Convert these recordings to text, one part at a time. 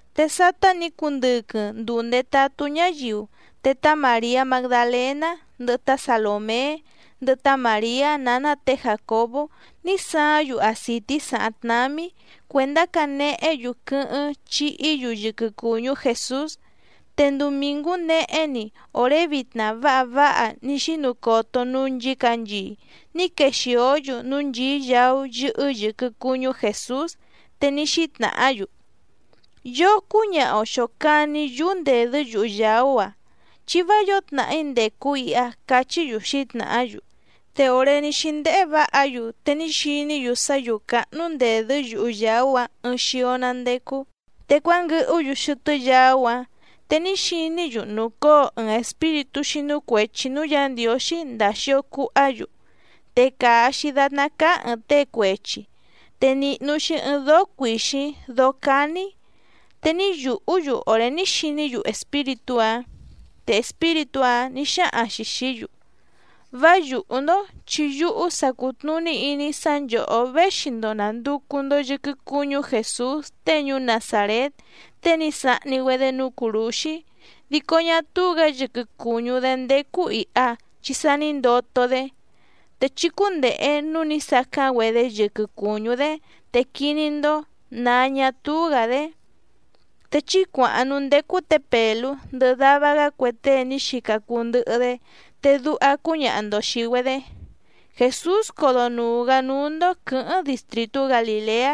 Te sátá nǐ cundɨquɨⁿ nduu ndètatú ñáyiu, te tá Màriá Magdalèná, ndɨhɨ tá Salòmé, ndɨhɨ tá Màriá nǎná tě Jàcobó ní saáⁿ‑yu acìtí sàháⁿ tnámí cuèndá canehé‑yu quɨ́hɨ́ⁿ chihí‑yu yɨquɨ cùñú Jèsús. Te ndumìngú nehé‑ni òré vitna váha váha ní xínu coto núú nchǐcanchii ní quexìó‑yu núú nchìí yaú yɨ́hɨ́ yɨ̀quɨ cuñú Jèsús. Te ní xítnàhá‑yu: —Yoo cúñaha‑o xòcani yúú ndèdɨ́ yuhu yàú‑a, chi vá yǒo tnàhí ndècu iha —cachí‑yu xǐtnàhá‑yu. Te òré ní xíndéhé vǎha‑yu te ní xiní‑yu sá yǔú cáhnú ndèdɨ́ yuhu yàú‑áⁿ ɨɨⁿ xio‑ná ndécú. Te cuánguɨhú‑yu xɨtɨ́ yaú‑áⁿ, te ní xiní‑yu nùcóo ɨɨⁿ espíritú xínú cuèchi núú Yǎ Ndiǒxí ndàa xio cuhá‑yu, te càa‑xi datná cáá ɨ̀ɨⁿ tée cuechi, te nìhnu‑xi ɨɨⁿ dóó cuìxíⁿ dóó cání, te ní yùhú‑yu òré ní xiní‑yu espíritú‑áⁿ. Te espíritú‑áⁿ nǐ xáhaⁿ‑xi xìí‑yu: —Vá yùhú‑ndó, chi yúhú sa cùtnuní iní‑í sá nchòhó véxi‑ndo nànducu‑ndo yɨquɨ cuñú Jèsús tée ñuú Nazàrét tée ní sahni‑güedé núú cùrúxí, dico ñá túú‑gǎ yɨquɨ cùñú‑dé ndécú ìha chi sa ní ndoto‑dé, te chí cúndèhe núú nǐ sacáⁿ‑güedé yɨquɨ cùñú‑dé te quiní‑ndó nǎ ñá túú‑gǎ‑dé. Te chí cuàháⁿ núú ndécú tě Pèlú ndɨhɨ dava‑gá cue tée ní xica cuu ndɨhɨ‑dé, te duha cúñaha‑ndo xìi‑güedé: “Jèsús codonùu‑gá núú‑ndó quɨ̌hɨ́ⁿ distrìtú Galìleá,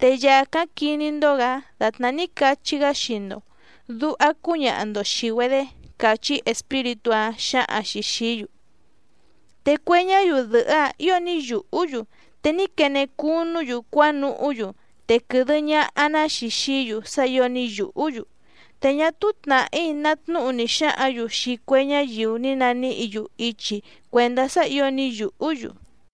te yàcáⁿ quiní‑ndó‑gǎ dàtná ní cachí‑gá xii‑ndo”, duha cúñaha‑ndo xìi‑güedé —càchí espíritú‑áⁿ xǎhaⁿ‑xi xìí‑yu. Te cue ñáyiu dɨ̀hɨ́‑áⁿ ǐo ní yùhú‑yu, te ní quene cunú‑yu cuánuhú‑yu, te quɨ̀dɨ ñaha‑ná‑xi xií‑yu sá ǐo ní yùhú‑yu, te ñá túú tnàhí ná tnúhu ni xǎhǎⁿ‑yu xii cue ñáyiu ní naníhǐ‑yu ichi cuèndá sá ǐo ní yùhú‑yu.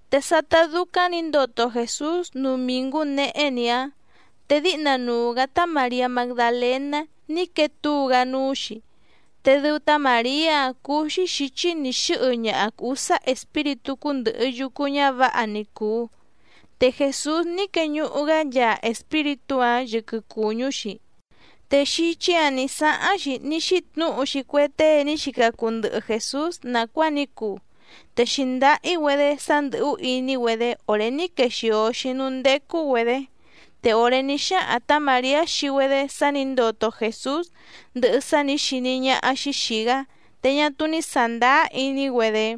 Te sátá dúcáⁿ nǐ ndoto Jèsús ndumìngú nehé‑ni‑áⁿ, te díhna nuu‑gǎ tá Màriá Magdalèná ní quee túu‑gá núú‑xi, te dɨu tá Màriá‑áⁿ cúú‑xí xǐchí nǐ xɨ́hɨ ñaha ǔsá espíritú cúndɨ̀hɨ yucu ñávǎha ni cùu, te Jèsús ní queñuhu‑gá nchaa espíritú‑áⁿ yɨquɨ cùñú‑xi. Te xíchí‑ǎⁿ nǐ sáháⁿ‑xi ní xítnǔhu‑xi cue tée ní xica cuu ndɨhɨ Jèsús nàcuáa ní cuu, te xǐndáhí‑güedé sá ndɨ̀hú iní‑güedé òré ní quexìo‑xi núú ndécú‑güedě. Te òré ní xáhaⁿ tǎ Màriá xii‑güedé sá nǐ ndoto Jèsús ndɨhɨ sá nǐ xiní ñáhá‑xí xìi‑gá, te ñá túú ní sàndáá iní‑güedé.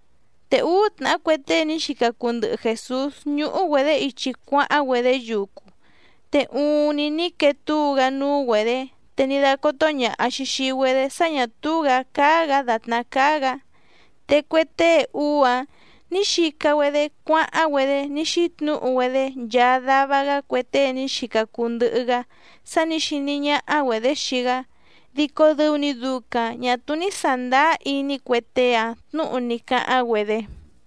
Te úú tnàhá cue tée ní xica cuu ndɨhɨ Jèsús ñúhú‑güedě ichi cuáháⁿ‑güedé yucu, te uuⁿni ní quee túu‑gá núú‑güedě, te ní dácótó ñàha‑xi xii‑güedé sá ñà túú‑gǎ cáá‑gǎ dàtná cáá‑gǎ. Te cue tée úú‑áⁿ nǐ xica‑güedé cuáháⁿ‑güedé ní xítnǔhu‑güedé nchaa dava‑gá cue tée ní xica cuu ndɨhɨ‑gá sá nǐ xiní ñáhá‑güedě xii‑gá, dico dɨu‑ni ducaⁿ ñà túú ní sàndáá iní cue tée‑áⁿ tnǔhu ní cáháⁿ‑güedé.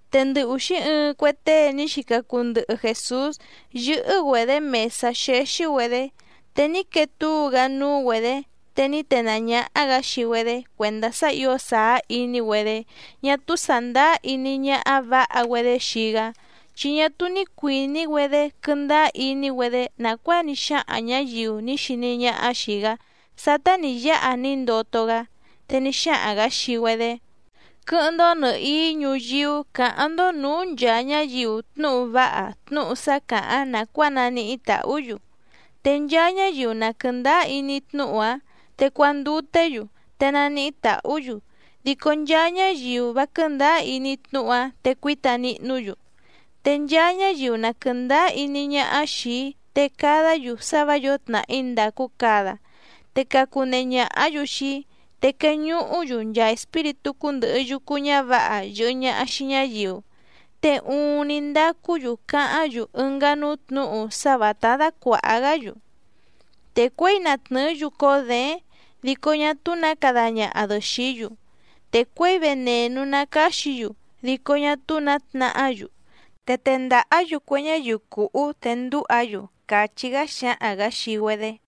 Te ndɨ ùxí ɨɨⁿ cue tée ní xica cuu ndɨhɨ Jèsús yɨ́hɨ́‑güedě mèsá xéxí‑güedě, te ní quee túu‑gá núú‑güedě te ní tenàá ñáhá‑gǎ xii‑güedé cuèndá sá ǐo sàá iní‑güedé ñá túú sàndáá iní ñáhá vǎha‑güedé xii‑gá, chi ñá túú ní cuìní‑güedé quɨ́ndáá iní‑güedé nàcuáa ní xáhaⁿ ñǎyiu ní xiní ñáhá xìi‑gá sátá nǐ yáha ní ndoto‑gá. Te ní xáhaⁿ‑gǎ xii‑güedé: —Quɨ́hɨ́ⁿ‑ndó nɨ̀hií ñuyíú cǎháⁿ‑ndó nǔú nchàa ñáyiu tnúhu váha tnúhu sá càháⁿ nàcuáa naníhí tàhú‑yu. Te nchaa ñáyiu na quɨ̀ndáá iní tnúhu‑áⁿ te cuanduté‑yu, te naníhí tàhú‑yu, dico nchaa ñáyiu vá quɨ̀ndáá iní tnúhu‑áⁿ te cuíta nihnú‑yu. Te nchaa ñáyiu na quɨ̀ndáá iní ñáhá xìi‑í te cadá‑yu sá vǎ yǒo tnàhí ndàcu cada, te cacunehe ñàhá‑yu xii‑í, te queñuhú‑yu nchaa espíritú cúndɨ̀hɨ yucu ñávǎha yɨ̀hɨ ñaha xii ñáyiu. Te uuⁿni ndacú‑yu cáháⁿ‑yu ɨngá núú tnǔhu sá vǎtá dácuàha‑gá‑yu. Te cuěi na tnɨ̀ɨ́‑yu cóó děéⁿ dico ñá túú nǎ cada ñaha‑dɨ xìí‑yu, te cuěi venènú ná cáxǐ‑yu dico ñá túú nǎ tnahá‑yu, te tendàhá‑yu cue ñáyiu cùhú te ndúha‑yu —càchí‑gá xǎhaⁿ‑gǎ xii‑güedé.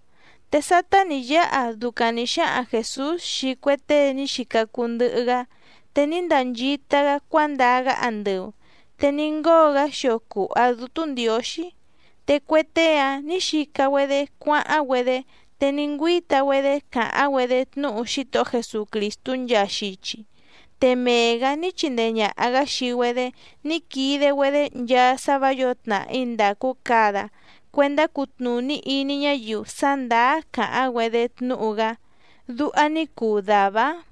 Te sátá nǐ yáha ducaⁿ nǐ xáhaⁿ Jèsús xii cue tée ní xica cuu ndɨhɨ‑gá, te ní ndanchita‑gá cuándaa‑gá andɨu te ní ngóo‑gá xio cùha Dútú Ndiǒxí. Te cue tée‑áⁿ nǐ xica‑güedé cuáháⁿ‑güedé, te ní ngüíta‑güedé càháⁿ‑güedé tnúhu Xítohó Jesucrìstú nchaa xichi. Te mee‑gǎ ní chindee ñàha‑gá xii‑güedé ní quide‑güedé nchaa sá vǎ yǒo tnàhí ndàcu cada cuendá cutnùní iní ñáyiu sá ndàá càháⁿ‑güedé tnúhu‑gá. Duha ní cuu dàvá‑áⁿ.